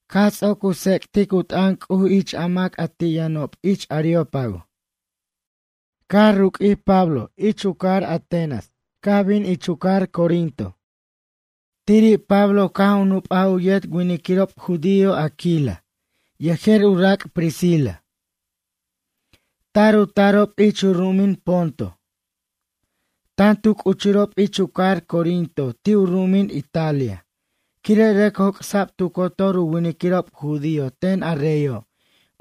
Caj ts'oc u tsec'tic u t'ʌn C'uj ich a mac a ti' yʌnob ich Areópago, caj ruq'uij Pablo ich u cajar Atenas caj bin ich u cajar Corinto. Tiri' Pablo caj u nup'aj u yet winiquirob judío Aquila, yejer u rac' Priscila. Tar u tarob ich u ru'umin Ponto. Tan tu c'uchurob ich u cajar Corinto ti' u ru'umin Italia, quire' rʌc joc'sa'b tu cotor u winiquirob judío ten a reyo',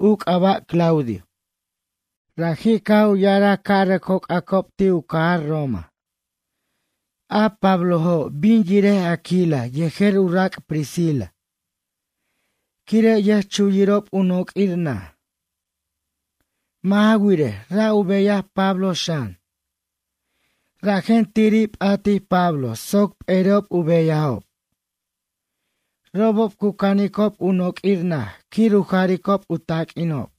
u c'aba' Claudio. Raji' caj u ya'araj ca' rʌc joc'acob ti' u cajar Roma. A Pablojo', bin yirej Aquila yejer u rac' Priscila. Quire' yʌjchuyirob u noq'uir naj. Mʌ' ja wirej, ra' u beyaj Pablo xan. Rajen tiri' p'atij Pablo soc p'eri'ob u beyajob. Robob cu canicob u noq'uir naj quir u jaricob u taq'uinob.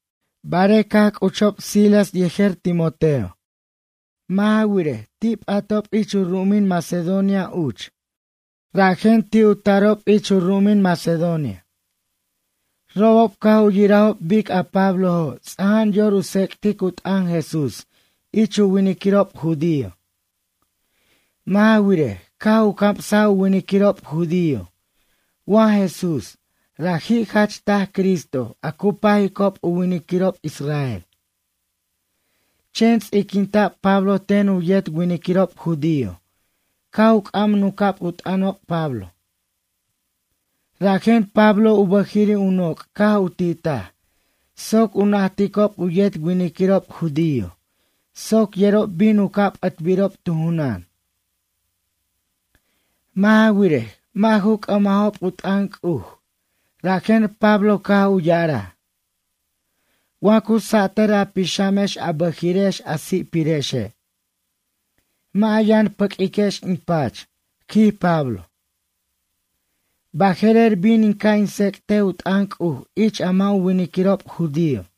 Barej caj c'uchob Silas yejer Timoteo. Mʌ' ja wirej, ti' p'atob ich u ru'umin Macedonia uch, rajen ti' u tarob ich u ru'umin Macedonia. Robob caj u yirajob bic a Pablojo' ts'ajan yor u tsec'tic u t'ʌn Jesús ich u winiquirob judío. Mʌ' ja wirej, caj u camsaj u winiquirob judío wa Jesús, raji' jach taj Cristo a cu pajicob u winiquirob israel. Chen ts'iquinta'b Pablo ten u yet winiquirob judío, caj c'am nunca'b u t'ʌnob Pablo. Rajen Pablo u bʌjiri' u noc' caj u titaj, soc u najticob u yet winiquirob judío soc yerob bin u ca' p'ʌtbirob tu junan. Mʌ' ja wirej, mʌ' ju c'ʌmajob u t'ʌn C'uj, rajen Pablo caj u ya'araj: ―Wa cu satʌr a pixamex a bʌjiri'ex a si'pirexe'. Mʌ' a yʌn pʌq'uiquex in pach ―quij Pablo―. Baje'rer bin in ca' in tsec'tej u t'ʌn C'uj ich a mʌ' u winiquirob judío.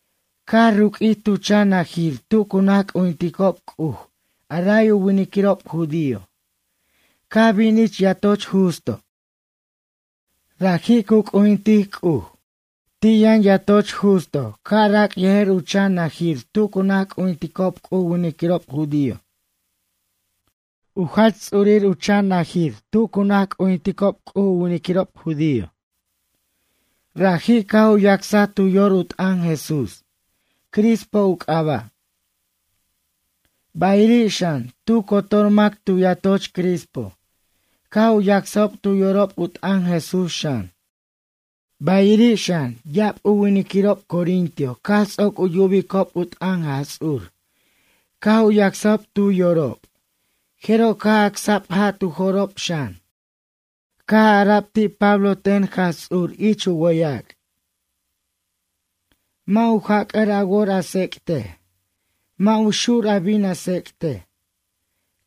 Caj ruq'uij tu chan najir tu cu naj c'ujinticob C'uj a ray u winiquirob judío, caj bin ich yatoch Justo. Raji' cu c'ujintic C'uj. Ti' yʌn yatoch Justo ca'rac' yejer u chan najir tu cu naj c'ujinticob C'uj u winiquirob judío. U jach ts'urir u chan naj tu cu naj c'ujinticob C'uj u winiquirob judío. Raji' caj u yacsaj tu yor u t'ʌn Jesús. Crispo u c'aba'. Bayiri' xan, tu cotor mac tu yatoch Crispo caj u yacsajob tu yorob u t'ʌn Jesús xan. Bayiri' xan, ya'ab u winiquirob corintio caj ts'oc u yubicob u t'ʌn Jaj Ts'ur caj u yacsajob tu yorob, jeroj caj acsa'b ja' tu jo'rob xan. Caj ara'b ti' Pablo ten Jaj Ts'ur ich u wʌyac': ―Mʌ' u jac'ʌr a wor a tsec'tej. Mʌ' u xur a bin a tsec'tej.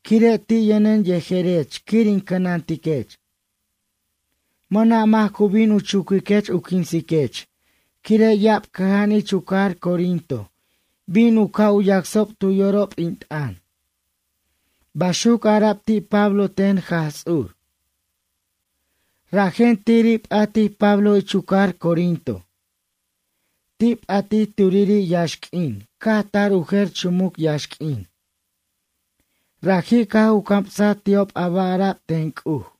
Quire' ti' yʌnen yejerech quir in cʌnantiquech. Mʌna' mac cu bin u chuquiquech u quinsech quire' ya'ab cʌja'an ich u cajar Corinto bin u ca' u yacsob tu yorob in t'ʌn ―baxuc ara'b ti' Pablo ten Jaj Ts'ur. Rajen tiri' p'atij Pablo ich u cajar Corinto. Ti' p'atij turiri' yaxq'uin caj tar u jer chumuc yaxq'uin. Raji' caj u camsaj ti'ob a ba' ara'b ten C'uj.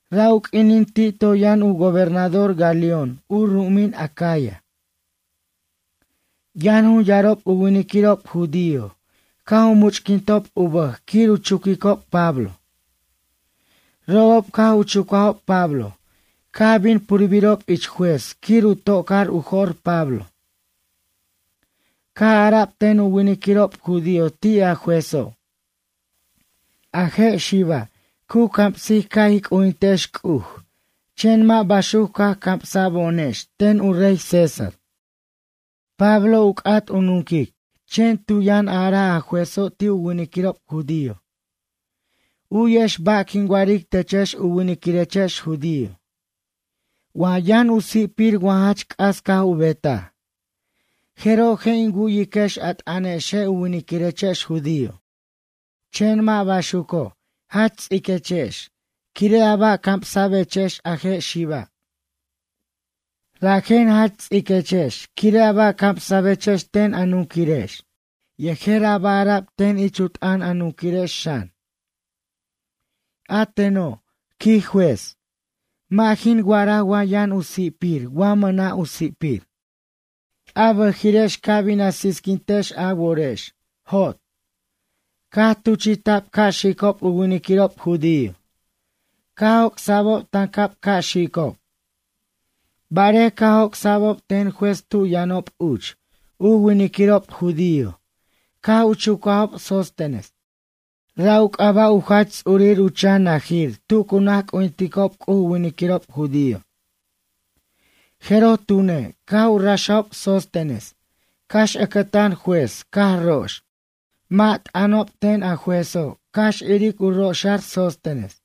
Ra' u q'uinin ti' toy yʌn u gobernador Galión u ru'umin Acaya. Yʌn jun yarob u winiquirob judío, caj u much'quintob u bʌj quir u chuquicob Pablo. Robob caj u chucajob Pablo, caj bin purbirob ich juez quir u tocar u jo'r Pablo. Caj ara'b ten u winiquirob judío ti' a juezo': ―A je' xiba', cu camsic ca' ij c'ujintex C'uj chen mʌ' baxuc caj camsa'bo'onex ten u rey César. Pablo u c'at u nunquic, chen tu yʌn araj a juezo' ti' u winiquirob judío: ―U'yex ba' quin wa'aric techex u winiquirechex judío. Wa yʌn u si'pir wa jach c'as caj u betaj, jeroj je' in wu'yiquex a t'ʌnexe' u winiquirechex judío. Chen mʌ' baxuco', jach ts'iquechex, quire' a ba' camsa'bechex a je' xiba'. Rajen jach ts'iquechex quire' a ba' camsa'bechex ten a nunquirex yejer a ba' ara'b ten ich u t'ʌn a nunquirex xan. A teno' ―quij juez―, mʌ' jin wa'araj wa yʌn u si'pir wa mʌna' u si'pir. A bʌjiri'ex ca bin a sisquintex a worex. Jot. Caj tuchi'ta'b ca' xicob u winiquirob judío. Caj joc'sa'bob tancab ca' xicob. Barej caj joc'sa'bob ten juez tu yʌnob uch, u winiquirob judío caj u chucajob Sóstenes. Ra' u c'aba' u jach ts'urir u chan najir tu cu naj c'ujinticob C'uj u winiquirob judío. Jeroj tune', caj u raxajob Sóstenes, cax ʌcʌtan juez caj rox. Mʌ' t'ʌnob ten a juezo' cax iric cu roxa'r Sóstenes.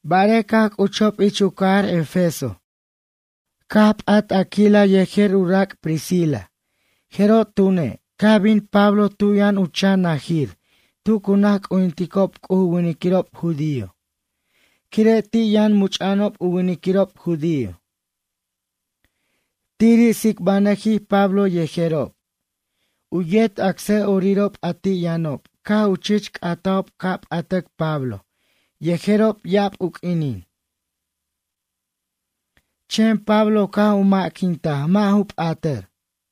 Barej caj c'uchob ich u cajar Efeso, caj p'at Aquila yejer u rac' Priscila, jeroj tune', caj bin Pablo tu yʌn u chan najir tu cu naj c'ujinticob C'uj u winiquirob judío, quire' ti' yʌn much'a'anob u winiquirob judío. Tiri' tsicbanʌjij Pablo yejerob. U yet acsa'orirob, a ti' yʌnob caj u chich c'atajob ca' p'atʌc Pablo yejerob ya'ab u q'uinin. Chen Pablo caj u ma'quintaj mʌ' ju p'atar.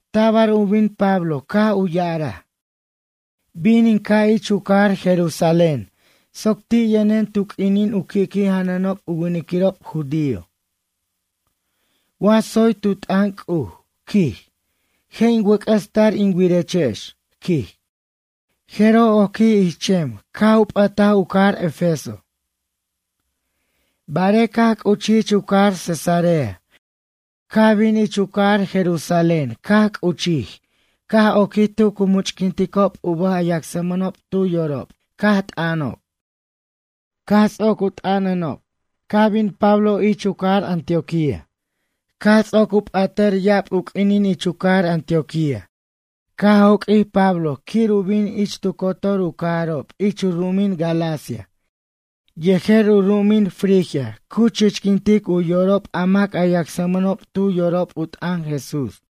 Tabar u bin Pablo caj u ya'araj: ―Bin in ca' ich u cajar Jerusalén soc ti' yʌnen tu q'uinin u qui'qui' janʌnob u winiquirob judío. Wa tsoy tu t'ʌn C'uj ―quij―, je' in wʌc'ʌs tar in wirechex ―quij. Jeroj oquij ich chem caj u p'ʌtaj u cajar Efeso. Barej caj c'uchij ich u cajar Cesarea, caj bin ich u cajar Jerusalén, caj c'uchij caj oquij tu cu much'quinticob u bʌj a yacsmʌnob tu yorob caj t'ʌnob. Caj ts'oc u t'ʌnanob caj bin Pablo ich u cajar Antioquía. Caj ts'oc u p'atʌr ya'ab u q'uinin ich u cajar Antioquía, caj joq'uij Pablo quir u bin ich tu cotor u cajarob ich u ru'umin Galacia yejer u ru'umin Frigia cu chichquintic u yorob a mac a yacsmʌnob tu yorob u t'ʌn Jesús.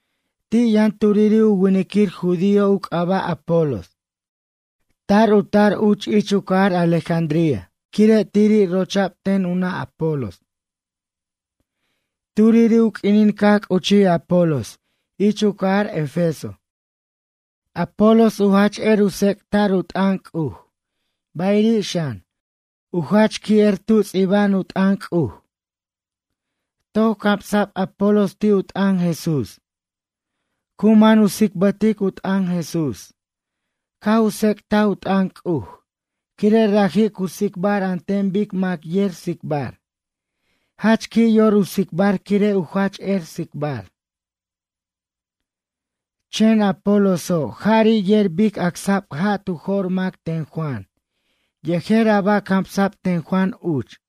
Ti' yʌn turiri' u winiquir judío u c'aba' Apolos. Tar u tar uch ich u cajar Alejandría, quire' tiri' rocha'b ten u nʌ' Apolos. Turiri' u q'uinin caj c'uchij Apolos ich u cajar Efeso. Apolos u jach er u tsec'ta'r u t'ʌn C'uj, bayiri' xan, u jach qui' er tu ts'iba'an u t'ʌn C'uj. Toc camsa'b Apolos ti' u t'ʌn Jesús. Cu man u tsicbʌtic u t'ʌn Jesús, caj u tsec'taj u t'ʌn C'uj, quire' raji' cu tsicbar an ten bic mac yer tsicbar, jach qui' yor u tsicbar quire' u jach er tsicbar. Chen Apoloso', jari' yer bic acsa'b ja' tu jo'r mac ten Juan, yejer a ba' camsa'b ten Juan uch.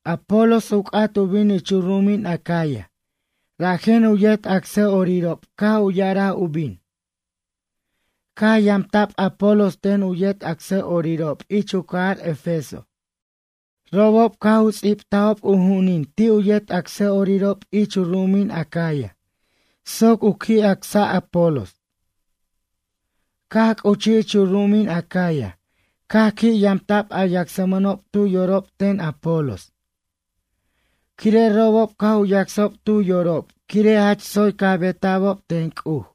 Apolos u c'at u bin ich u ru'umin Acaya, rajen u yet acsa'orirob caj u ya'araj u bin. Caj yamta'b Apolos ten u yet acsa'orirob ich u cajar Efeso. Robob caj u ts'ibtajob u ju'unin ti' u yet acsa'orirob ich u ru'umin Acaya soc u qui' acsa' Apolos. Caj c'uchij ich u ru'umin Acaya caj qui' yamta'b a yacsmʌnob tu yorob ten Apolos. Quire' robob caj u yacsajob tu yorob quire' jach tsoy caj beta'bob ten C'uj.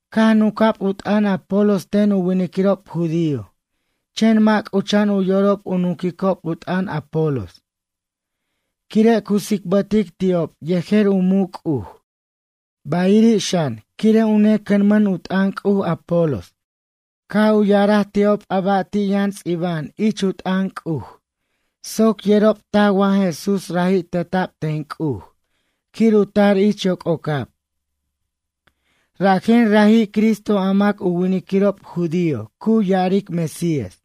Caj nunca'b u t'ʌn Apolos ten u winiquirob judío, chen mʌ' c'ucha'an u yorob u nunquicob u t'ʌn Apolos. Quire' cu tsicbʌtic ti'ob yejer u muc' C'uj, bayiri' xan, quire' u necʌnmʌn u t'ʌn C'uj, Apolos. Caj u ya'araj ti'ob a ba' ti' yʌn ts'iba'an ich u t'ʌn C'uj, soc yerob taj wa Jesús raji' teta'b ten C'uj, quir u tar ich yoc'ocab, rajen raji' Cristo a mac u winiquirob judío cu ya'aric Mesías.